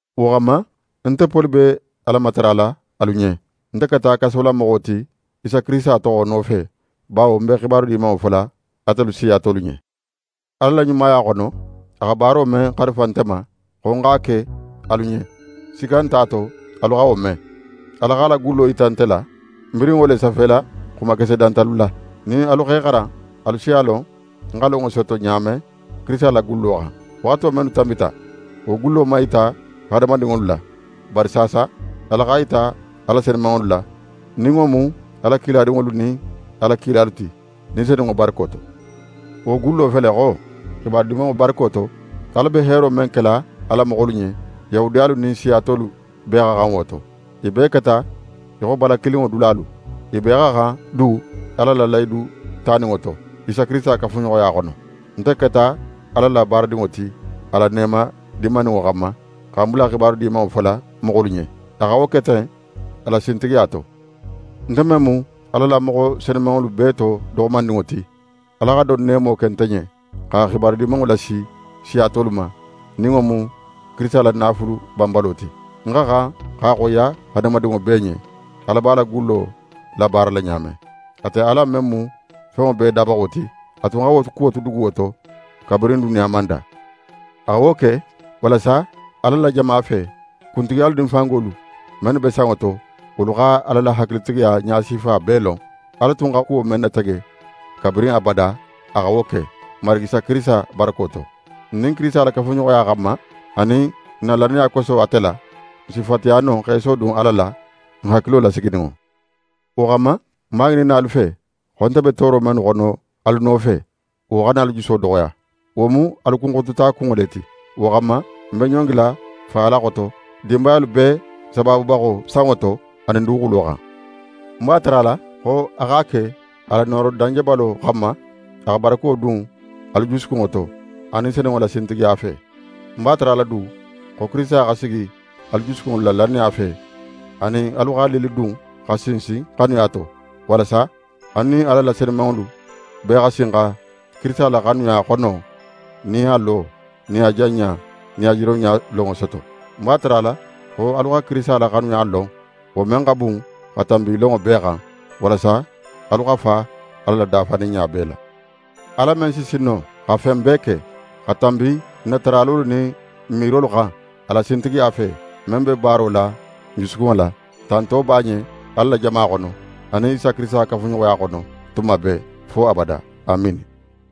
Wo xanma, nte Poli be Ala matarala alu ɲen. Nte keta kasolamoxo ti Isa Kirisita toxo nofe, bawo ń be xibaru Dimanŋo fola atelu siya tolu ɲen. Ala la ɲumaya xono, a xa baaro men xarifa nte ma, xo ń x'a ke alu ɲen, sikka nte a to alu xa wo me. Ala x'a la gallo yita nte la. Ń birin wo le safela xumakese dantalu la. Nin alu x'e xaran, alu si a lon ń xa lonŋo soto ɲa men Kirisita la gullo xan. Waxato mennu tanbita, wo gullo man yita hadamadinŋolu la; bari saasa, Ala x'a yita a la senumanŋolu la, nin wo mu a la kiladinŋolu nin a la kilalu ti, Ni Senunŋo barako to. Wo gullo fele xo: Xibaru Dimanŋo barako to, Ala be heero men kela a la moxolu ɲen, Yahudiyalu nin siya tolu bee xa xan wo to. I bee keta í xo bala kilinŋo dulalu. I bee xa xan du Ala la lahidu taninŋo to, Isa Kirisita kafuɲoxoya xono. Nte keta Ala la baaradinŋo ti a la neema dinmaninŋo xanma, xa ń bula Xibaru Dimanŋo fola moxolu ɲen. A xa wo ke ten a la sintigiya to. Nte men mu Ala la moxo senumanŋolu bee to doxomandinŋo ti, Ala xa don neemo ke nte ɲen, xa Xibaru Dimanŋo lasi siya tolu ma, nin wo mu Kirisita la naafulu banbalo ti. Ń xa xan x'a xoyiya hadamadinŋo bee ɲen, Ala b'a la gullo labaarala ɲa men. Ate Ala men mu fenŋo bee dabaxo ti, a tun xa wo kuwo tu duguwo to kabirin duniya man da. A xa wo ke walasa Ala la jama fe; kuntigiyalu nin fangolu mennu be sanŋo to, wolu xa Ala la hakilitigiya ɲasifa bee lon. Ala tun xa kuwo men natege kabirin abada, a xa wo ke, n Marigi Isa Kirisita barako to. N nin Kirisita la kafuɲoxoya xanma, anin n na lannaya koso ate la, n si fatiya no x'e sodun Ala la, n hakilo lasigininŋo. Wo xanma, ń b'a ŋininna alu fe xo, nte be tooro mennu xono alu nofe, wo xana alu juso doxoya. Wo mu alu kunxotota kunŋo le ti. Wo xanma, ń be ɲongila Fa Ala xoto, dinbayalu bee sabaabubaxo, sanŋo to anin duguxulo xan. Ń b'a tarala xo a x'a ke a la nooro danjebalo xanma, a xa barako dun alu jusukunŋo to, a Ni Senunŋo la sintigiya fe. Ń b'a tarala du xo Kirisita xa sigi alu jusukunŋolu la lannaya fe; anin alu xa lillidun, xa sinsin xanuya to; walasa alu nin Ala la senumanŋolu bee xa sin xa Kirisita la xanuya xono nin a lo nin a janɲa nin a jironɲa lonŋo soto. Ń b'a tarala xo alu xa Kirisita la xanuya lon, wo men xa bun xa tanbi lonŋo bee xan; walasa alu xa fa Ala la dafaninɲa bee la. Ala men si sin no xa fen bee ke, xa tanbi n na taralolu nin n miirolu xan, a la sintigiya fe, men be baaro la n jusukunŋo la; tanto b'a ɲen Ala la jama xono, anin Isa Kirisita kafuɲoxoya xono, tuma bee, fo abada. Amiini.